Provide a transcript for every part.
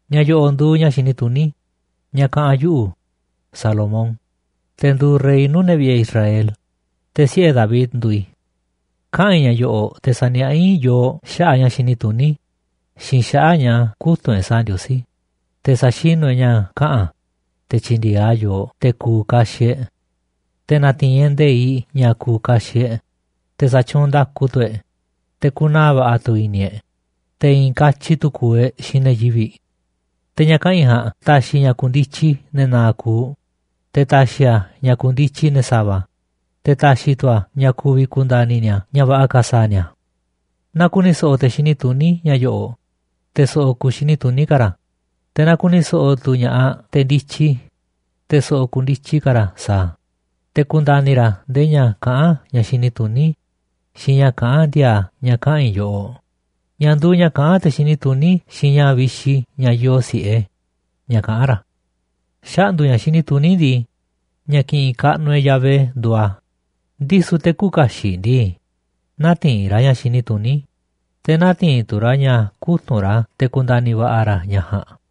Ña̱ yo̱ꞌo̱ꞌ nduuꞌ ña̱ xini tuní ña̱ kaꞌa̱n yuꞌu̱, Salomón, te̱ nduuꞌ rey nuu̱ꞌ ne̱ vi̱ꞌe̱ Israel, te̱ siꞌe̱ David nduuꞌ i̱. Kaꞌa̱n i̱ ña̱ yo̱ꞌo̱ꞌ te̱ sa̱niaꞌá i̱ yooꞌ xaꞌa̱ꞌ ña̱ xini tuní xiinꞌ xaꞌa̱ꞌ ña̱ kutu̱nꞌ e̱ꞌ sa̱a̱ Ndiosí, te̱ sa̱xinu̱ e̱ꞌ ña̱ kaꞌa̱n a̱, te̱ tyi̱ndi̱e̱eꞌ a̱ yooꞌ te̱ ku̱u̱ kaxiꞌ e̱ꞌ. Te̱ na̱ti̱i̱n e̱ꞌ nde̱iꞌ ña̱ ku̱u̱ kaxiꞌ e̱ꞌ, te̱ sa̱tyuunꞌ nda̱ku tu̱ e̱ꞌ, te̱ ku̱naa̱ va̱ꞌa̱ tu̱ i̱ni̱ e̱ꞌ, te̱ i̱i̱n katyi tu̱ ku̱u̱ e̱ꞌ xiinꞌ ne̱ yivi̱ꞌ. Te̱ ña̱ kaꞌa̱n i̱ ja̱a̱nꞌ ta̱xi̱ ña̱ ku̱ndityi ne̱ na̱a̱ꞌ kuuꞌ, te̱ ta̱xi̱ a̱ ña̱ ku̱ndityi ne̱ sa̱va̱, te̱ ta̱xi̱ tu̱ a̱ ña̱ ku̱vi̱ ku̱nda̱ni̱ ni̱a̱ ña̱ va̱ꞌa̱ ka̱ sa̱a̱ ni̱a̱. Na ku̱ni̱ so̱ꞌo̱ te̱ xini tuní ña̱ yo̱ꞌo̱ꞌ, te̱ so̱ꞌo̱ ku̱u̱ xini tuní ka̱ ra̱, te̱ na ku̱ni̱ so̱ꞌo̱ tu̱ ña̱ꞌaꞌ te̱ ndityi, te̱ so̱ꞌo̱ ku̱u̱ ndityi ka̱ ra̱ sa̱a̱ a̱, te̱ ku̱nda̱ni̱ ra̱ ndee ña̱ kaꞌán ña̱ xini tuní xiinꞌ ña̱ kaꞌán ndi̱a̱a̱ ña̱ kaꞌa̱n i̱ yoꞌoꞌ, ña̱ nduu ña̱ kaꞌán te̱ xini tuní xiinꞌ ña̱ vixi ña̱ yoo si̱ꞌe, ña̱ kaꞌán ra̱. Xaꞌndu̱ ña̱ xini tuní ndii, ña̱ kiꞌinꞌ kaꞌnuꞌ e̱ꞌ Yahvé nduuꞌ a̱, ndisu̱ te̱ küuꞌ kaxiꞌ ndii, nätiinꞌ ra̱ ña̱ xini tuní, te̱ nätiinꞌ tu̱ ra̱ ña̱ kutu̱nꞌ ra̱ te̱ ku̱nda̱ni̱ va̱ꞌa̱ ra̱ ña̱ ja̱a̱nꞌ.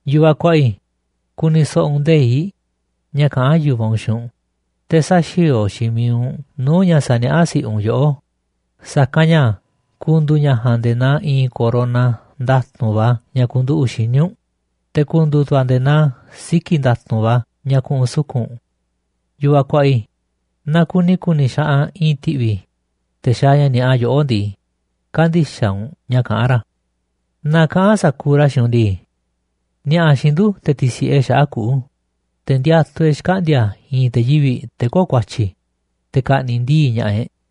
Yu̱vaꞌ kuaꞌa i̱, ku̱ni̱ so̱ꞌo̱ u̱nꞌ nde̱iꞌ ña̱ kaꞌán yu̱vaꞌ u̱nꞌ xiinꞌ u̱nꞌ, te̱ sä̱xi̱o̱o̱ xiinꞌ mi̱iꞌ u̱nꞌ nuu̱ꞌ ña̱ saniaꞌá si̱ꞌiꞌ u̱nꞌ yoꞌó. Sa̱kanꞌ ña̱ ku̱ndu̱u̱ ña̱ ja̱a̱nꞌ nde̱e̱ naa i̱i̱n corona nda̱tu̱nꞌ va̱ ña̱ ku̱nduꞌu̱ꞌ xíniꞌ u̱nꞌ, te̱ ku̱ndu̱u̱ tu̱ a̱ nde̱e̱ naa siki̱ nda̱tu̱nꞌ va̱ ña̱ ku̱ꞌu̱n suku̱nꞌ u̱nꞌ. Yu̱vaꞌ kuaꞌa i̱, naaꞌ kuni ku̱ni̱ xaꞌanꞌ i̱i̱n ti̱ꞌvi̱, te̱ xaaꞌ ña̱ ni̱a̱ꞌa yoꞌó ndii, kä̱ndi̱xaꞌ u̱nꞌ ña̱ kaꞌán ra̱. Naaꞌ kaꞌa̱n sa̱kuuꞌ ra̱ xiinꞌ u̱nꞌ ndii: “Ni̱a̱ꞌa̱ xiinꞌ ndu̱, te̱ ti̱si̱ꞌe e̱ꞌ xaꞌa̱ꞌ kuꞌu̱, te̱ ndiatuꞌ e̱ꞌ xkaꞌndi̱a̱ i̱i̱n te̱ yivi̱ꞌ, te̱ köo̱ꞌ ku̱a̱tyi̱, te̱ ka̱ꞌni̱ꞌ ndii̱ꞌ ña̱ꞌaꞌ e̱ꞌ.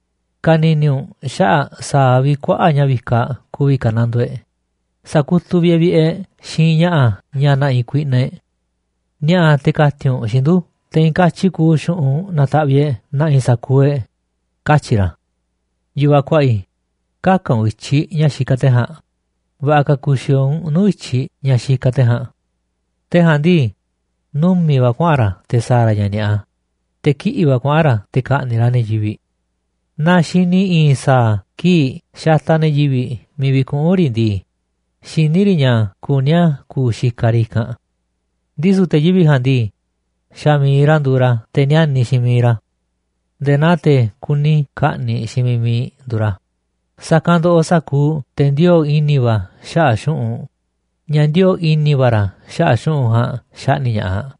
Ka̱ni̱ni̱ u̱nꞌ xaꞌa̱ꞌ sa̱a̱ vi̱ꞌ kuaꞌa̱ꞌ ña̱ vikaꞌ ku̱vi̱ ka̱nandoo e̱ꞌ, sa̱kutuꞌ vi̱ꞌ e̱ꞌ vi̱ꞌe̱ e̱ꞌ xiinꞌ ña̱ꞌa̱ ña̱ ne̱ꞌi̱ kuiꞌnaꞌ e̱ꞌ. Ni̱a̱ꞌa̱ te̱ ka̱ti̱n u̱nꞌ xiinꞌ ndu̱, te̱ i̱i̱n katyi kuuꞌ xu̱ꞌunꞌ na̱ta̱ꞌviꞌ e̱ꞌ na̱ꞌi̱ sa̱kuuꞌ e̱ꞌ”, katyi̱ ra̱. Yu̱vaꞌ kuaꞌa i̱, kä̱ka̱ u̱nꞌ i̱tyiꞌ ña̱ xikaꞌ te̱ ja̱a̱nꞌ. Va̱ꞌa̱ ka̱ ku̱xi̱o̱o̱ u̱nꞌ nuu̱ꞌ i̱tyiꞌ ña̱ xikaꞌ te̱ ja̱a̱nꞌ. Te̱ ja̱a̱nꞌ ndii, numi̱ꞌ va̱ kuaꞌa̱n ra̱ te̱ sa̱a̱ ra̱ ña̱ ni̱a̱ꞌa, te̱ kiꞌi̱ꞌ va̱ kuaꞌa̱n ra̱ te̱ ka̱ꞌni̱ꞌ ra̱ ne̱ yivi̱ꞌ. Naa xini i̱i̱n sa̱a̱ kii̱ꞌ xataꞌ ne̱ yivi̱ꞌ miiꞌ vi̱kuꞌu̱n riꞌ ndii, xiní riꞌ ña̱ kuní a̱ ku̱u̱ xikaꞌ riꞌ i̱kanꞌ. Ndisu̱ te̱ yivi̱ꞌ ja̱a̱nꞌ ndii, xa̱ mi̱iꞌ ra̱ nduuꞌ ra̱ te̱ níániꞌ xiinꞌ miiꞌ ra̱, nde̱e̱ naa te̱ kuni ka̱ꞌni̱ꞌ xiinꞌ miiꞌ mi̱iꞌ nduuꞌ ra̱. Sa̱kanꞌ ndoꞌoꞌ sa̱kuuꞌ te̱ ndioo̱ꞌ i̱ni̱ va̱ xaꞌa̱ꞌ xu̱ꞌunꞌ, ña̱ ndioo̱ꞌ i̱ni̱ va̱ ra̱ xaꞌa̱ꞌ xu̱ꞌunꞌ ja̱a̱nꞌ xaꞌni̱ꞌ ña̱ꞌaꞌ.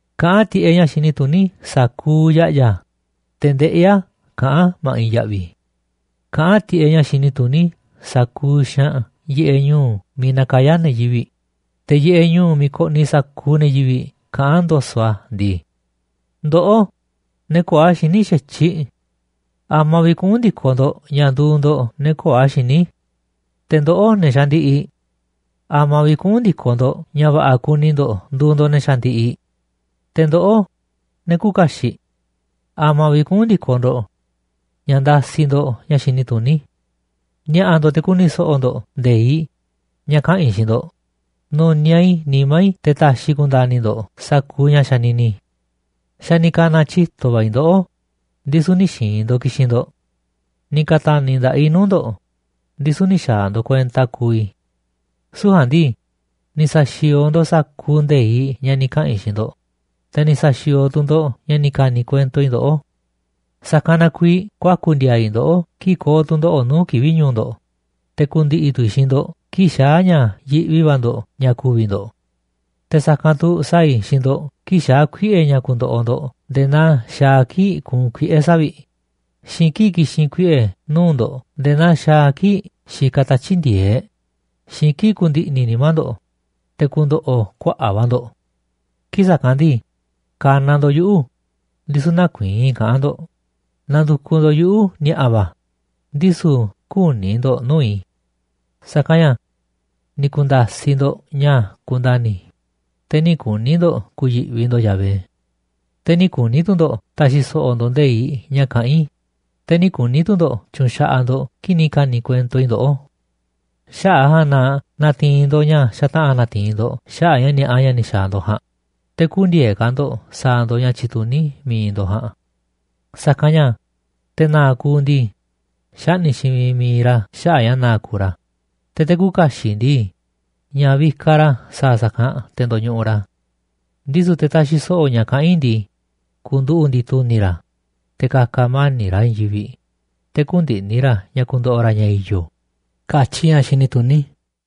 Kaꞌán tiꞌeꞌ ña̱ xini tuní sa̱kuuꞌ ya̱ꞌya̱, te̱ ndeꞌí a̱ kaꞌán a̱ ma̱ꞌiꞌ ya̱ꞌvi̱. Kaꞌán tiꞌeꞌ ña̱ xini tuní sa̱kuuꞌ xaanꞌ yiꞌeꞌ ñu̱u̱ miiꞌ nakayá ne̱ yivi̱ꞌ, te̱ yiꞌeꞌ ñu̱u̱ miiꞌ koꞌniꞌ sa̱kuuꞌ ne̱ yivi̱ꞌ kaꞌán ndo̱so̱ꞌ a̱ ndii: “Ndoꞌó, ne̱ köo̱ꞌ a̱ xiní xa̱tyiꞌ, ¿a̱ma̱a̱ vi̱ꞌ kuꞌu̱n ndi̱koꞌ ndo̱ꞌ ña̱ nduuꞌ ndo̱ꞌ ne̱ köo̱ꞌ a̱ xiní? Te̱ ndoꞌó, ne̱ xandiꞌiꞌ, ¿a̱ma̱a̱ vi̱ꞌ kuꞌu̱n ndi̱koꞌ ndo̱ꞌ ña̱ va̱ꞌa̱ kuni ndo̱ꞌ nduuꞌ ndo̱ꞌ ne̱ xandiꞌiꞌ? Te̱ ndoꞌó, ne̱ küuꞌ kaxiꞌ, ¿a̱ma̱a̱ vi̱ꞌ kuꞌu̱n ndi̱koꞌ ndo̱ꞌ ña̱ ndasiꞌ ndo̱ꞌ ña̱ xini tuní? Ni̱a̱ꞌa̱ ndo̱ꞌ te̱ ku̱ni̱ so̱ꞌo̱ ndo̱ꞌ nde̱iꞌ ña̱ kaꞌa̱n i̱ xiinꞌ ndo̱ꞌ. Nu̱niaꞌ i̱ nimá i̱ te̱ ta̱xi̱ i̱ ku̱nda̱ni̱ ndo̱ꞌ sa̱kuuꞌ ña̱ xanini i̱. Xa̱ ni̱ ka̱na̱ tyito̱ va̱ i̱ ndoꞌó, ndisu̱ nï̱ xi̱i̱n ndo̱ꞌ ki̱xi̱n ndo̱ꞌ. Ni̱ ka̱ta̱ni̱ nda̱ꞌaꞌ i̱ nuu̱ꞌ ndo̱ꞌ, ndisu̱ nï̱ xa̱a̱ ndo̱ꞌ kuenta kuuꞌ i̱. Süu̱ꞌ ja̱a̱nꞌ ndii, ni̱ sa̱xi̱o̱o̱ ndo̱ꞌ sa̱kuuꞌ nde̱iꞌ ña̱ ni̱ kaꞌa̱n i̱ xiinꞌ ndo̱ꞌ, te̱ ni̱ sa̱xi̱o̱o̱ tu̱ ndo̱ꞌ ña̱ ni̱ ka̱ni̱ kuento i̱ ndoꞌó. Sa̱kanꞌ na kuiiꞌ kuaku̱ ndi̱a̱a̱ i̱ ndoꞌó kii̱ꞌ ko̱o̱ tu̱ndoꞌo̱ꞌ nuu̱ꞌ kivi̱ꞌ ñu̱u̱ ndo̱ꞌ, te̱ ku̱ndi̱ꞌi̱ tu̱ i̱ xiinꞌ ndo̱ꞌ kii̱ꞌ xaa̱ ña̱ yiꞌvi va̱ ndo̱ꞌ ña̱ ku̱vi̱ ndo̱ꞌ. Te̱ sa̱kanꞌ tu̱ sa̱a̱ i̱ xiinꞌ ndo̱ꞌ kii̱ꞌ xaa̱ kuiꞌe̱ ña̱ ku̱ndo̱ꞌo̱ ndo̱ꞌ nde̱e̱ naa xaaꞌ a̱ kii̱ꞌ kuunꞌ kuiꞌe̱ savi̱ꞌ, xiinꞌ kii̱ꞌ ki̱xi̱n kuiꞌe̱ nuu̱ꞌ ndo̱ꞌ nde̱e̱ naa xaaꞌ a̱ kii̱ꞌ xikaꞌ tatyi̱ꞌ ndi̱e̱eꞌ, xiinꞌ kii̱ꞌ ku̱ndi̱ꞌni̱ nimá ndo̱ꞌ, te̱ ku̱ndo̱ꞌo̱ kuaꞌa̱ꞌ va̱ ndo̱ꞌ. Kii̱ꞌ sa̱kanꞌ ndii, ka̱na̱ ndo̱ꞌ yuꞌu̱, ndisu̱ nä̱ku̱i̱i̱n i̱ kaꞌán ndo̱ꞌ, na̱ndu̱kuꞌ ndo̱ꞌ yuꞌu̱ ni̱a̱ꞌa̱ va̱, ndisu̱ kü̱ni̱ ndo̱ꞌ nuu̱ꞌ i̱. Sa̱kanꞌ ña̱ ni̱ ku̱nda̱siꞌ ndo̱ꞌ ña̱ kundani̱, te̱ nï̱ kuni̱ ndo̱ꞌ ku̱yi̱ꞌvi ndo̱ꞌ Yahvé. Te̱ nï̱ kuni̱ tu̱ ndo̱ꞌ ta̱xi̱ so̱ꞌo̱ ndo̱ꞌ nde̱iꞌ ña̱ kaꞌán i̱, te̱ nï̱ kuni̱ tu̱ ndo̱ꞌ tyu̱nxaꞌaꞌ ndo̱ꞌ kii̱ꞌ ni̱ ka̱ni̱ kuento i̱ ndoꞌó. Xaꞌa̱ꞌ a̱ ja̱a̱nꞌ na na̱ti̱i̱n ndo̱ꞌ ña̱ xataꞌa̱n na̱ti̱i̱n ndo̱ꞌ xaꞌa̱ꞌ ña̱ ni̱a̱ꞌa ña̱ ni̱ xa̱a̱ ndo̱ꞌ ja̱a̱nꞌ, te̱ kü̱ndi̱e̱eꞌ ka̱ ndo̱ꞌ sa̱a̱ ndo̱ꞌ ña̱ tyituní mi̱iꞌ ndo̱ꞌ ja̱a̱nꞌ. Sa̱kanꞌ ña̱ te̱ na̱a̱ꞌ kuuꞌ ndii, xaꞌni̱ꞌ xiinꞌ miiꞌ mi̱iꞌ ra̱ xaꞌa̱ꞌ a̱ ña̱ na̱a̱ꞌ kuuꞌ ra̱, te̱ te̱ küuꞌ kaxiꞌ ndii, ña̱ vikaꞌ ra̱ sa̱a̱ sa̱kanꞌ te̱ ndo̱ñuꞌuꞌ ra̱. Ndisu̱ te̱ taxiꞌ so̱ꞌo̱ ña̱ kaꞌán i̱ ndii, ku̱nduꞌu̱ꞌ ndi̱tu̱ni̱ ra̱, te̱ ka̱ka̱ mani̱ꞌ ra̱ i̱i̱n yivi̱ꞌ, te̱ kü̱ndi̱ꞌni̱ ra̱ ña̱ ku̱ndo̱ꞌo̱ ra̱ ña̱ i̱yo̱”, katyi ña̱ xini tuní.